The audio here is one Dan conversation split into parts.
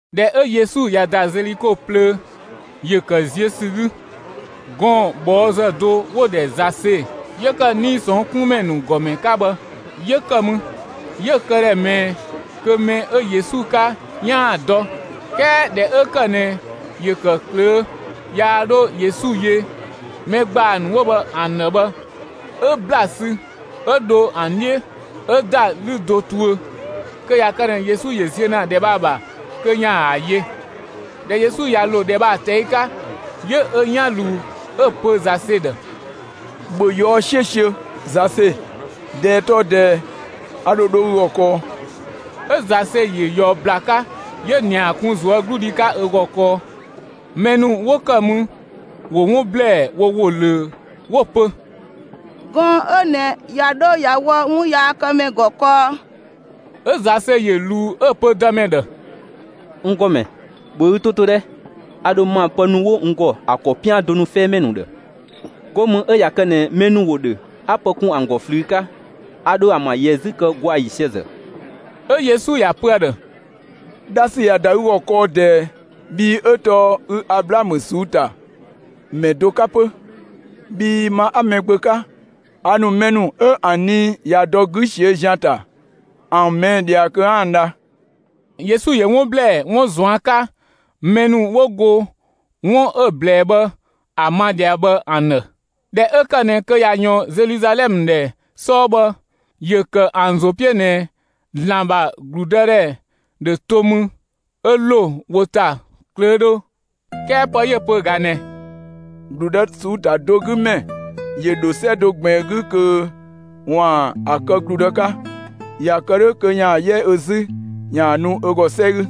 ꞊Dhɛ 'ö Yesu ꞊ya ‑da Zeliko plöö, ‑yö ‑kë ziö ‑sü 'gü, gɔɔn‑ ꞊bhɔɔzë do 'wo‑ ‑dhɛ Zase 'yö ‑kë 'nii‑ ꞊sɔnng' 'kun ‑mɛ ‑nu ‑gɔmɛ 'ka bhë 'yö ‑kë mü. 'Yö‑ këdhɛ ꞊mɛɛ kö mɛ 'ö Yesu 'ka 'yaan‑ ‑a dɔ. 'Kɛɛ ꞊dhɛ 'ö kë ꞊nɛ ‑yö ‑kë ꞊klöö', yaa 'dho Yesu yö mɛ ‑gbaa ‑nu 'wo bhë ‑an ‑dhë bhë, 'Ö ‑bla sü 'ö dho ‑an 'dhiö 'ö ‑da 'lü do tuö, kö ꞊ya kë ꞊nɛ Yesu ‑yö ziö ‑na ‑dhɛ bhë ‑a ‑bha kö 'yaan‑ ‑a yö. ꞊Dhɛ Yesu ꞊ya ‑lo ‑dhɛ bhë ‑a ꞊tɛi' 'ka, 'yö ö 'yan ꞊luu 'ö‑ pö Zase ‑dhë: «‑Bhö ꞊yɔɔ'‑ 'siösiö, Zase, ꞊dɛɛ tɔɔ ꞊dɛɛ, a ‑dho dho ü ‑gɔ kɔɔ!» 'Ö Zase ‑yö ꞊yɔɔ ‑bla 'ka, 'yö‑ ‑nia kun ꞊zuögludhi 'ka ö ‑gɔ kɔɔ. Mɛ ‑nu 'wo ‑kë mü ‑wo 'wun ‑blɛɛ wo ‑wo ꞊löö 'wo‑ pö: «Gɔɔn‑ 'ö ꞊nɛ ꞊ya 'dho ꞊ya wɔ 'wunyaakëmɛ ‑gɔ kɔɔ!» 'Ö Zase ‑yö ꞊luu 'ö‑ pö Dëmɛ ‑dhë: «N ‑Gɔmɛ, ‑bhö ü 'to 'to 'dhɛ! A ‑dho ma pë ‑nu 'wo n ‑gɔ, ‑a ‑kɔ 'pian do nu 'fɛɛmɛ ‑nu ‑dhë, 'go mü 'ö ꞊ya kë ꞊nɛ mɛ ‑yö ‑dhö 'a pë kun ‑a ‑gɔ ꞊flüü 'ka, 'a dho ‑a ‑bha ‑yɛ 'zü kë ‑gwaa ‑yiisië ‑zë.» 'Ö Yesu ‑ya pö ‑a ‑dhë: «Dha ‑sü ꞊ya ‑da ü ‑gɔ kɔɔ ꞊dɛɛ bhii 'ö tɔɔ ü Ablaamö ꞊suu'‑ ‑ta ‑mɛ do 'ka 'pö. Bhii ma 'a Mɛgbö 'ka, a ‑nu mɛ ‑nu 'ö ‑an nii ꞊ya dɔ 'gü ꞊siö' ‑zian ‑ta ‑an ꞊mɛɛ' ꞊dhia kö 'a ‑an dha.» Yesu ‑yö 'wun ‑blɛɛ 'wun ꞊zuan' 'ka mɛ ‑nu 'wo go 'wun 'ö‑ ꞊blɛɛ bhë ‑a ma ꞊dhia bhë ‑an ‑dhë. ꞊Dhɛ 'ö ‑kë ꞊nɛ kö ꞊ya ꞊yɔɔn Zeluzalɛmë ‑dhɛ 'sɔɔ bhë, ‑yö ‑kë ‑an ‑zo 'piö ꞊nɛ ‑Zlan ‑bha ‑gludëdhɛ ‑dhö to mü 'ö ‑lo wo ‑ta ꞊klöödhö. 'Kɛɛ pë 'yö‑ pö ꞊ga ꞊nɛ: «‑Gludë ꞊suu'‑ ‑ta do 'gü ‑mɛ ‑yö ‑dho 'sɛ do ꞊gbiin 'gü kö ‑waan ‑a kë ‑gludë 'ka. ꞊Ya kë 'dhö kö ‑yaan 'yɛ ö ‑zü ‑yaan nu ö ‑gɔ 'sɛ 'gü.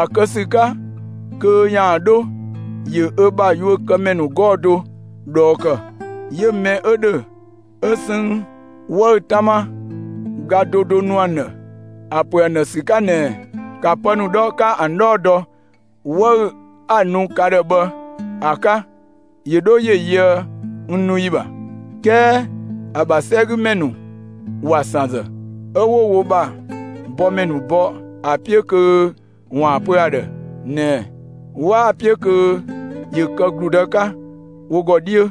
‑A kë ‑sü 'ka kö ‑yaan 'dho, ‑yö ö bha yuökëmɛ ‑nu 'gɔɔ‑ do ꞊dhɔɔ ‑kë, 'yö mɛ 'ö ‑dhö 'ö 'sënng 'wëü‑ 'tama ga do do nu ‑a ‑dhë ‑a ‑pö ‑an ‑dhë ‑sü 'ka ꞊nɛɛ: ‹‑Ka pë ‑nu 'dhɔ 'ka ‑an 'dhɔɔ dɔ 'wëü‑ 'a‑ nu ka ‑dhë bhë ‑a 'ka ‑yö 'dho ‑yö yöë n nu ‑yi ‑bha!› 'Kɛɛ ‑a ‑bha 'sɛgümɛ ‑nu ‑wa ‑san ‑zë, 'ö 'wo wo ‑bha bɔmɛ ‑nu bɔ ‑a 'piö kö ‑waan ‑a pö ‑a ‑dhë ꞊nɛɛ 'waa‑ 'piö kö ‑yö kë ‑gludë 'ka wo ‑gɔ 'dhiö.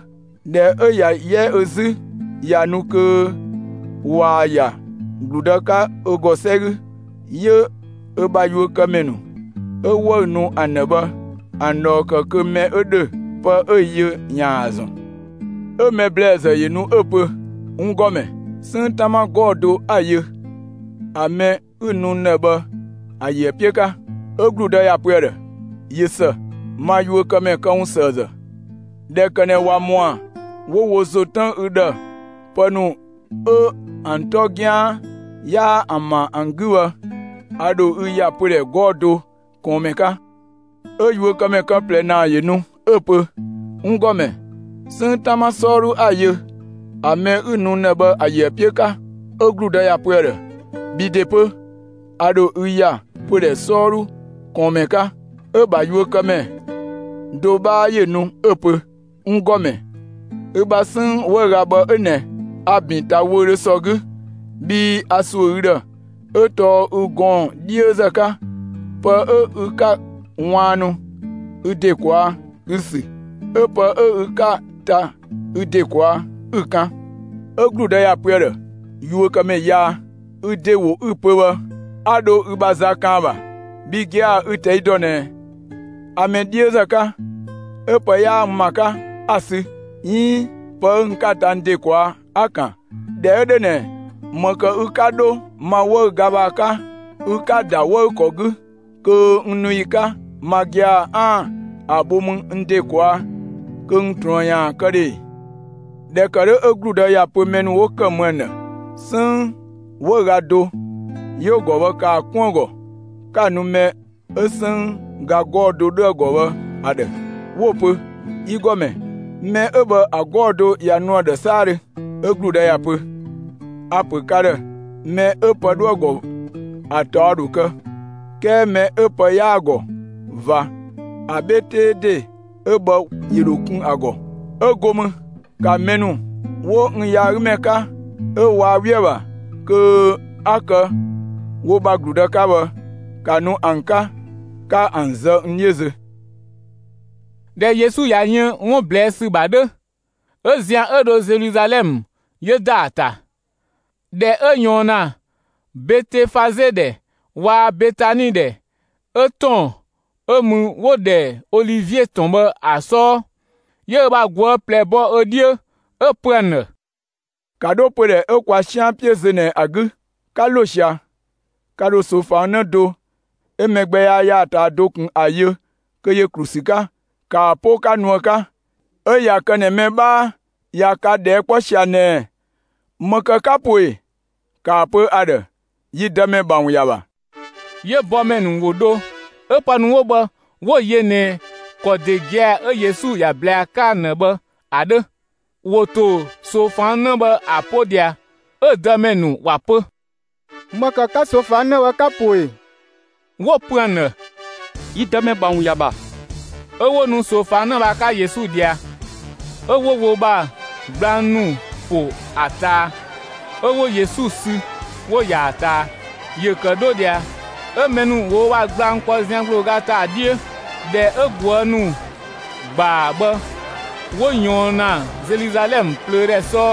꞊Dhɛ 'ö ꞊ya 'yɛ ö 'zü ꞊ya nu kö ꞊waa‑ ‑ya ‑gludë 'ka ö ‑gɔ 'sɛ 'gü, 'yö ö bha yuökëmɛ ‑nu 'ö 'wëü‑ nu ‑an ‑dhë bhë ‑an ꞊dhɔɔ ‑kë kö mɛ 'ö ‑dhö pë 'yö‑ yö ‑yaan ‑a ‑zɔn. 'Ö mɛ ‑blɛɛzë ‑yö nu 'ö‑ pö: ‹N ‑Gɔmɛ, 'sënng 'tama 'gɔɔ‑ do 'a‑ yö, ‑a mɛ 'ü‑ nu n ‑dhë bhë ‑a ‑yö ‑a 'piö 'ka.› 'Ö ‑gludë ‑ya pö ‑a ‑dhë: ‹꞊Yö ‑së, ma yuökëmɛ këwunsëëzë. ꞊Dhɛ ‑kë ꞊nɛ ‑wa ‑mɔa 'wo wo ‑zo tën ü ‑dhë pë ‑nu 'ö ‑an 'tɔ 'gian 'yaa ‑an ‑bha ‑an 'gü bhë, a ‑dho ü ‑ya pödhɛ 'gɔɔ‑ do ꞊kɔɔnmɛ 'ka.› 'Ö yuökëmɛ kë ꞊plɛ ‑naa ‑yö nu 'ö‑ pö: ‹N ‑Gɔmɛ, 'sënng 'tama 'sɔɔdhu 'a‑ yö ‑a mɛ 'ü‑ nu n ‑dhë bhë ‑a ‑yö ‑a 'piö 'ka.› 'Ö ‑gludë ‑ya pö ‑a ‑dhë: ‹Bhi ‑de 'pö, a ‑dho ü ‑ya pödhɛ 'sɔɔdhu ꞊kɔɔnmɛ 'ka.› 'Ö‑ ‑bha yuökëmɛ do 'bhaa ‑yö nu 'ö‑ pö: ‹N ‑Gɔmɛ, ü bha 'sënng 'wëüga bhë 'ö ꞊nɛ; a‑ ‑bin ‑ta wöödhö ‑sɔ 'gü, bhii a ‑suö ü ‑dhë, 'ö tɔɔ ü gɔɔn‑ 'dhiözë 'ka, pë 'ö ü 'ka‑ ꞊waannu ü ‑de ꞊kwaa' 'ü‑ ‑sü, 'ö pë 'ö ü 'ka‑ ta ü ‑de ꞊kwaa' 'ü‑ kan.› 'Ö ‑gludë ‑ya pö ‑a ‑dhë: ‹Yuökëmɛ yaa, ü ‑de ‑wo 'ü‑ pö bhë 'a dho ü ‑bha za kan ‑a ‑bha; bhi gia‑ ü‑ ꞊tɛi' dɔ ꞊nɛ a mɛ 'dhiözë 'ka, 'ö pë 'yaa n ‑ma 'ka, 'a‑ sü, 'iin pë 'ö n 'ka‑ ta n ‑de ꞊kwaa', 'a‑ ‑kan! ꞊Dhɛ 'ö 'dhö ꞊nɛ, ‑më ‑kë ü 'ka dho ma 'wëüga bhë ‑a 'ka ü 'ka‑ ‑da 'wëükɔ 'gü kö n nu ‑yi 'ka ma gia‑ 'aan‑ ‑a bho mü n ‑de ꞊kwaa' kö n ꞊truën ‑yaan kë ‑dhö ‑e?› ꞊Dhɛ ‑kë 'dhö 'ö ‑gludë ‑ya pö mɛ ‑nu 'wo ‑kë mü ‑an ‑dhë: ‹'Sënng 'wëüga do 'yö‑ ‑gɔ bhë, ‑kaa 'kun ‑a ‑gɔ 'ka‑ nu mɛ 'ö 'sënng ga 'gɔɔ‑ do 'dhö ‑a ‑gɔ bhë ‑a ‑dhë!› 'Wo‑ pö: ‹Yi ‑Gɔmɛ, mɛ 'ö bhë ‑a 'gɔɔ‑ do ꞊ya nu ‑a ‑dhë 'saadhö!› 'Ö ‑gludë ‑ya pö: ‹A‑ ‑pö ka ‑dhë mɛ 'ö pë 'dhoë‑ ‑gɔ, ‑a ‑taɔ ‑dho kë; 'kɛɛ mɛ 'ö pë 'yaa‑ ‑gɔ ꞊va, ‑a 'bhe 'tee ‑de 'ö bhë ‑yö ‑dho kun ‑a ‑gɔ. 'Ö go mü, ‑ka mɛ ‑nu 'wo n yaagümɛ 'ka 'ö waa 'we ‑a ‑bha kö a ‑kë wo ‑bha ‑gludë 'ka bhë, ‑ka nu ‑an 'ka 'ka ‑an zë n 'dhiö zö!›» ꞊Dhɛ Yesu ꞊ya yën 'wun ꞊blɛɛ' ‑sü ‑bha 'dhö, 'ö zian 'ö dho Zeluzalɛmë 'yö ‑da ‑a ‑ta. ꞊Dhɛ 'ö ꞊yɔɔn ‑na Betefaze ‑dhɛ waa‑ Betani ‑dhɛ, 'ö ‑tɔn 'ö mü 'wo‑ ‑dhɛ Olivie ‑tɔn bhë ‑a 'sɔɔ, 'yö ö bha ꞊guë' ꞊plɛ bɔ ö 'dhiö, 'Ö‑ pö ‑an ‑dhë: «‑Ka 'dho pödhɛ 'ö kwa 'sian 'piö zö ꞊nɛ ‑a 'gü. 'Ka ‑lo ꞊sia, ka ‑dho ꞊soofang 'në do 'ö mɛ gbɛ yaa ‑ya ‑a ꞊taa do ꞊kun ‑a yö kö ‑yö ‑klu ‑sü 'ka, ‑kaa 'po 'ka nu ‑a 'ka! 'Ö ꞊ya kë ꞊nɛ mɛ 'bhaa ꞊ya ka ꞊dhɛɛ' 'kpɔ ꞊sia ꞊nɛɛ: ‹‑Më ‑kë 'ka‑ po ꞊e?›, ‑kaa pö ‑a ‑dhë: ‹Yi Dëmɛ ‑bha ‑wun ‑ya ‑bha›.» 'Yö bɔmɛ ‑nu ‑wo ‑dho; 'ö pë ‑nu 'wo bhë 'wo‑ yö ꞊nɛ ‑kɔ ‑de gia‑ 'ö Yesu ‑ya ꞊blɛɛ ‑a 'ka ‑an ‑dhë bhë ‑a 'dhö. ‑Wo ‑to ꞊soofang 'në bhë ‑a 'po ꞊dhia, 'ö‑ dëmɛ ‑nu ‑wa pö: «‑Më ‑kë 'ka ꞊soofang 'në bhë 'ka‑ po ꞊e?» 'Wo‑ pö ‑an ‑dhë: «Yi Dëmɛ ‑bha ‑wun ‑ya ‑bha.» 'Ö 'wo nu ꞊soofang 'në bhë ‑a 'ka Yesu ꞊dhia, 'ö 'wo wo ‑bha gblang ‑nu ‑po ‑a ꞊taa, 'ö 'wo Yesu sü 'wo‑ ‑yaa ꞊taa. ‑Yö ‑kë 'dho ꞊dhia, 'ö mɛ ‑nu ‑wo wo ‑bha gblang ‑kpɔ zian ‑gblooga ‑ta ‑a 'dhiö. ꞊Dhɛ 'ö ꞊guë' ‑nu ‑gbaa bhë 'wo ꞊yɔɔn ‑na Zeluzalɛmë plöödhɛ 'sɔɔ,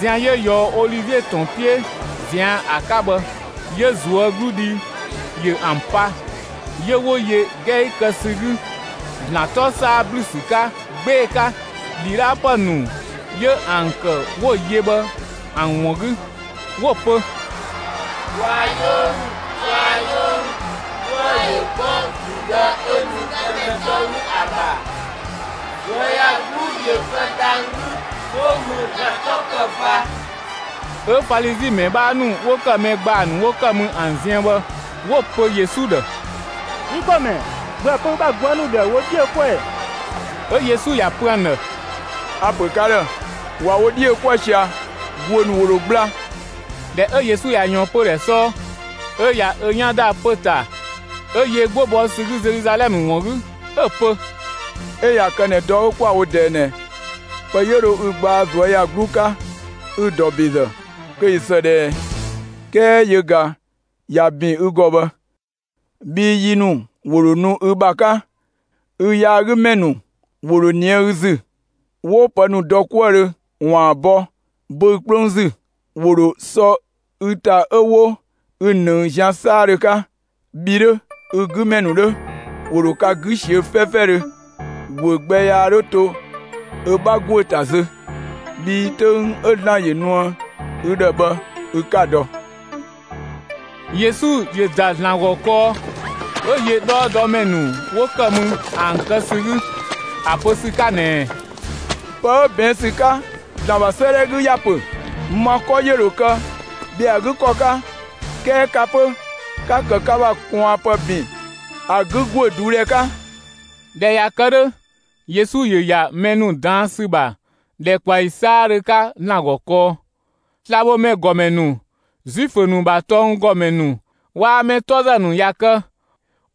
zian 'yö ꞊yɔɔ Olivie ‑tɔn 'piö ꞊zian' ‑a 'ka bhë, 'yö ꞊zuögludhi ‑yö ‑an pa; 'yö 'wo yö 'gɛi kë ‑sü 'gü ‑Zlan 'tɔ 'saa ‑blü ‑sü 'ka 'gbee‑ 'ka ‑dhidhaapë ‑nu 'yö ‑an ‑kë 'wo‑ yö bhë ‑an ‑wun 'gü, 'wo‑ pö: «Kwaa‑ 'yoo ‑mü! Kwaa‑ 'yoo ‑mü! 'Dhuë‑ ‑yö 'kpɔ ‑gludë 'ö nu Dëmɛ 'tɔ 'gü ‑a ‑bha, ꞊zuöyagluu ‑yö kë dhang‑ 'gü, 'go mü ‑Zlan 'tɔ‑ kë ꞊va!» 'Ö Falizi ‑mɛ 'bhaa ‑nu 'wo ‑kë mɛ ‑gbaa ‑nu 'wo ‑kë mü ‑an ziën bhë, 'wo‑ pö Yesu ‑dhë: «Yi ‑Gɔmɛ, ‑bhöë pö ü bha ꞊guë' ‑nu ‑dhë ‑wo wo 'dhi yö 'kuë‑ ‑ɛ!» 'Ö Yesu ‑ya pö ‑an ‑dhë: «A‑ ‑pö ka ‑dhë: ꞊Wa wo 'dhi ‑yö 'kuë‑ ꞊sia, ‑guö ‑nu ‑wo ‑dho gbla!» ꞊Dhɛ 'ö Yesu ꞊ya ꞊yɔɔn pödhɛ 'sɔɔ, 'ö ꞊ya ö 'yan ‑da pö‑ ‑ta 'ö yö 'gbo bɔ ‑sü 'gü Zeluzalɛmë ‑wun 'gü, 'Ö‑ pö: «'Ö ꞊ya kë ꞊nɛ dɔ 'ö 'kwa‑ wo ꞊dɛɛ ꞊nɛ, pë 'yö dho ü gbaa ꞊zuöyagluu 'ka ü‑ ‑dɔ ‑bezë, kö ꞊yö ‑së ꞊dhɛɛ, 'kɛɛ yö ꞊ga ꞊ya ‑bin ü ‑gɔ bhë, bhii yi ‑nu ‑wo ‑dho nu ü ‑bha 'ka, ü yaagümɛ ‑nu ‑wo ‑dho ꞊nië' ü ‑zü, 'wo pë ‑nu dɔ 'kuëdhö ‑waan bɔ böü‑ 'kplong ‑zü; ‑wo ‑dho sɔ ü ‑ta 'ö 'wo ü ‑nëng zian 'saadhö 'ka. Bhi 'dhö, ü 'gü ‑mɛ ‑nu 'dhö, ‑wo ‑dho ka 'gü ꞊siö'‑ 'fɛfɛdhö, ‑guö gbɛ yaa 'dho to ö 'bha ‑guö ‑ta zö. Bhii 'töng 'ö ‑Zlan ‑yö nuë ü ‑dhë bhë ü 'ka‑ dɔ!» Yesu ‑yö ‑da ‑Zlan ‑gɔ kɔɔ, 'ö yö 'dhɔɔdɔmɛ ‑nu 'wo ‑kë mü ‑an kë ‑sü 'gü ‑a pö ‑sü 'ka ꞊nɛɛ: «Pë 'ö ꞊bɛɛn' ‑sü 'ka ‑Zlan ‑bha 'sëëdhɛ 'gü ‑ya pö: Ma 'kɔ ‑yö ‑dho kë ‑bhɛa ‑a 'gü ‑kɔ 'ka, 'kɛɛ ka 'pö, 'ka‑ ‑kë ka ‑bha ꞊kwaanpë ‑bin ‑a 'gü ‑guö ꞊duudhɛ 'ka!» ꞊Dhɛ ꞊ya kë 'dhö, Yesu ‑yö ‑ya mɛ ‑nu ꞊daan' ‑sü ‑bha ‑dhɛkpaɔyi 'saadhö 'ka ‑Zlan ‑gɔ kɔɔ. Slabhomɛ ‑gɔmɛ ‑nu, Zuifö ‑nu ‑bha tɔnggɔmɛ ‑nu waa‑ mɛtɔzë ‑nu ꞊ya kë,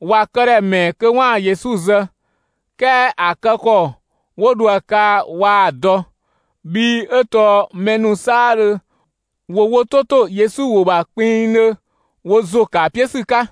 ‑wa këdhɛ ‑mɛɛ kö 'waan‑ Yesu zë, 'kɛɛ ‑a kë ‑kɔ 'wo dho ‑a kaa waa‑ dɔ, bhii 'ö tɔɔ mɛ ‑nu 'saadhö ‑wo wo 'to ‑to Yesu ‑wo ‑bha kpinngdhö wo ‑zo ‑kë ‑a 'piö ‑sü 'ka.